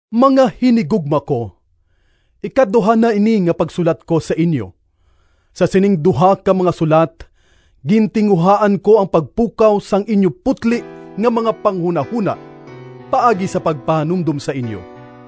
Mga hinigugma ko! Ikaduha na ini nga pagsulat ko sa inyo. Sa sining duha ka mga sulat gintinguhaan ko ang pagpukaw sang inyo putli nga mga panghunahona paagi sa pagpahanumdom sa inyo.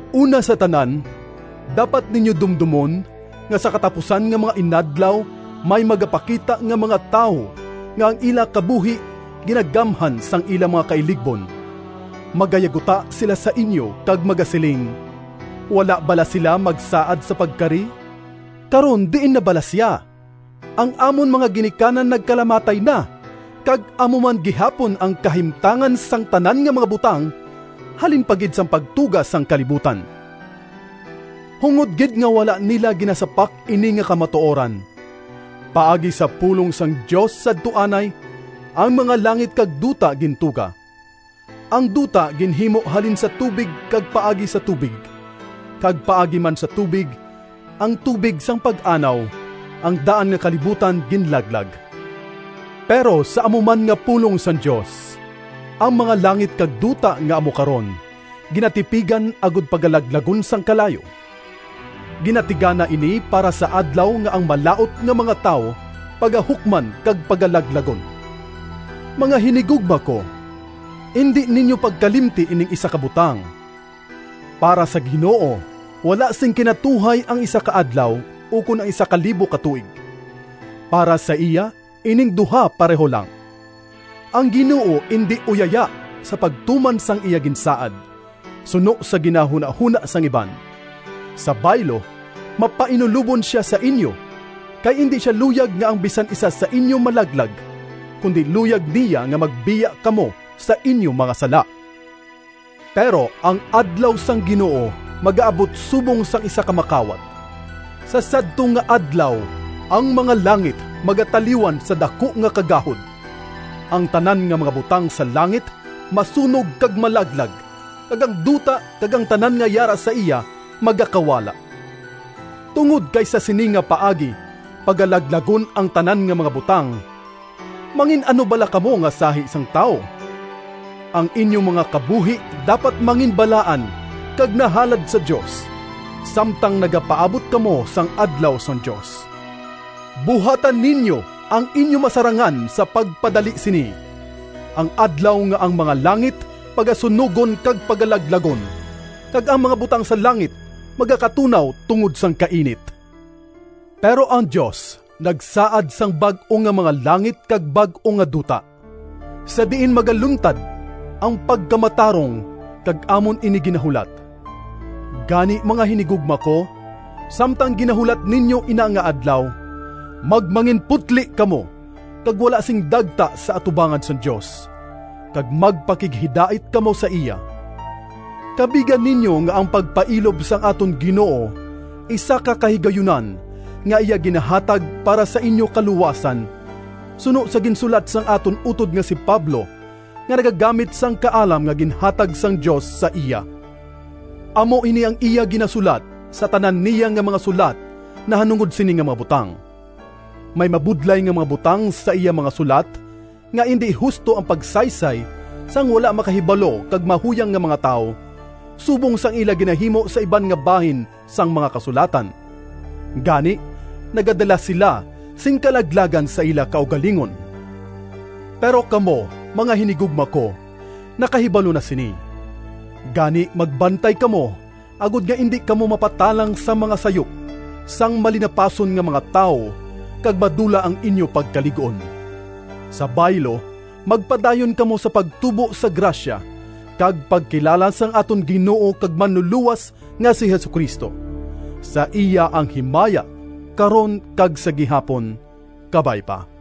Una sa tanan, dapat ninyo dumdomon nga sa katapusan nga mga inadlaw, may magapakita nga mga tawo nga ang ila kabuhi ginagamhan sang ila mga kailigbon. Magayaguta sila sa inyo kag magasiling, “Wala bala sia magsaad sa pagkari? Karon diin na bala sia? Ang amon mga ginikanan nagkalamatay na, kag amo man gihapon ang kahimtangan sang tanan nga mga butang halin pa gid sang pagtuga sang kalibutan!” Hungod gid nga wala nila ginasapak ini nga kamatuoran: paagi sa pulong sang Dios sadto anay, ang mga langit kag duta gintuga. Ang duta ginhimo halin sa tubig kag paagi sa tubig. Kag paagi man sa tubig, ang tubig sang Pag-anaw, ang daan nga kalibutan ginlaglag. Pero sa amo man nga pulong sang Dios, ang mga langit kag duta nga amo karon, ginatipigan agod pagalaglagon sang kalayo. Ginatigana ini para sa adlaw nga ang malaut nga mga tawo pagahukman kag pagalaglagon. Mga hinigugma ko, indi ninyo pagkalimti ining isa ka butang! Para sa Ginoo wala sing kinatuhay ang isa ka adlaw ukon ang isa ka libo ka tuig. Para sa iya ining duha pareho lang. Ang Ginoo indi uyaya sa pagtuman sang iya ginsaad, suno sa ginahunahona sang iban. Sa baylo, mapainulobon sia sa inyo, kay indi sia luyag nga ang bisan isa sa inyo malaglag, kundi luyag niya nga magbiya kamo sa inyo mga sala. Pero ang Adlaw sang Ginoo magaabot subong sang isa ka makawat. Sa sadto nga Adlaw ang mga langit magataliwan sa daku nga kagahod, ang tanan nga mga butang sa langit masunog kag malaglag, kag ang duta kag ang tanan nga yara sa iya magakawala. Tungod kay sa sini nga paagi pagalaglagon ang tanan nga mga butang, mangin-ano bala kamo nga sahi sang tawo? Ang inyo mga kabuhi dapat manginbalaan kag nahalad sa Dios, samtang nagapaabot kamo sang Adlaw sang Dios. Buhata ninyo ang inyo masarangan sa pagpadali sini—ang Adlaw nga ang mga langit pagasunogon kag pagalaglagon, kag ang mga butang sa langit magakatunaw tungod sang kainit. Pero ang Dios nagsaad sang bag-o nga mga langit kag bag-o nga duta, sa diin magaluntad ang pagkamatarong, kag amon ini ginahulat. Gani, mga hinigugma ko, samtang ginahulat ninyo ina nga Adlaw, magmanginputli kamo kag wala sing dagta sa atubangan sang Dios, kag magpakighidait kamo sa iya. Kabiga ninyo nga ang pagpailob sang aton Ginoo isa ka kahigayunan nga iya ginahatag para sa inyo kaluwasan, suno sa ginsulat sang aton utod nga si Pablo nga nagagamit sang kaalam nga ginhatag sang Dios sa iya. Amo ini ang iya ginasulat sa tanan niya nga mga sulat nahanungod sini nga mga butang. May mabudlay nga mga butang sa iya mga sulat nga indi husto ang pagsaysay sang wala makahibalo kag mahuyang nga mga tawo, subong sang ila ginahimo sa iban nga bahin sang mga Kasulatan. Gani nagadala sila sing kalaglagan sa ila kaugalingon. Pero kamo, mga hinigugma ko, nakahibalo na sini. Gani magbantay kamo, agod nga indi kamo mapatalang sang mga sayop sang malinapason nga mga tawo kag madula ang inyo pagkalig-on. Sa baylo magpadayon kamo sa pagtubo sa grasya kag pagkilala sang aton Ginoo kag Manlulowas nga si Jesu-Cristo. Sa iya ang himaya, karon kag sa gihapon! Kabay pa.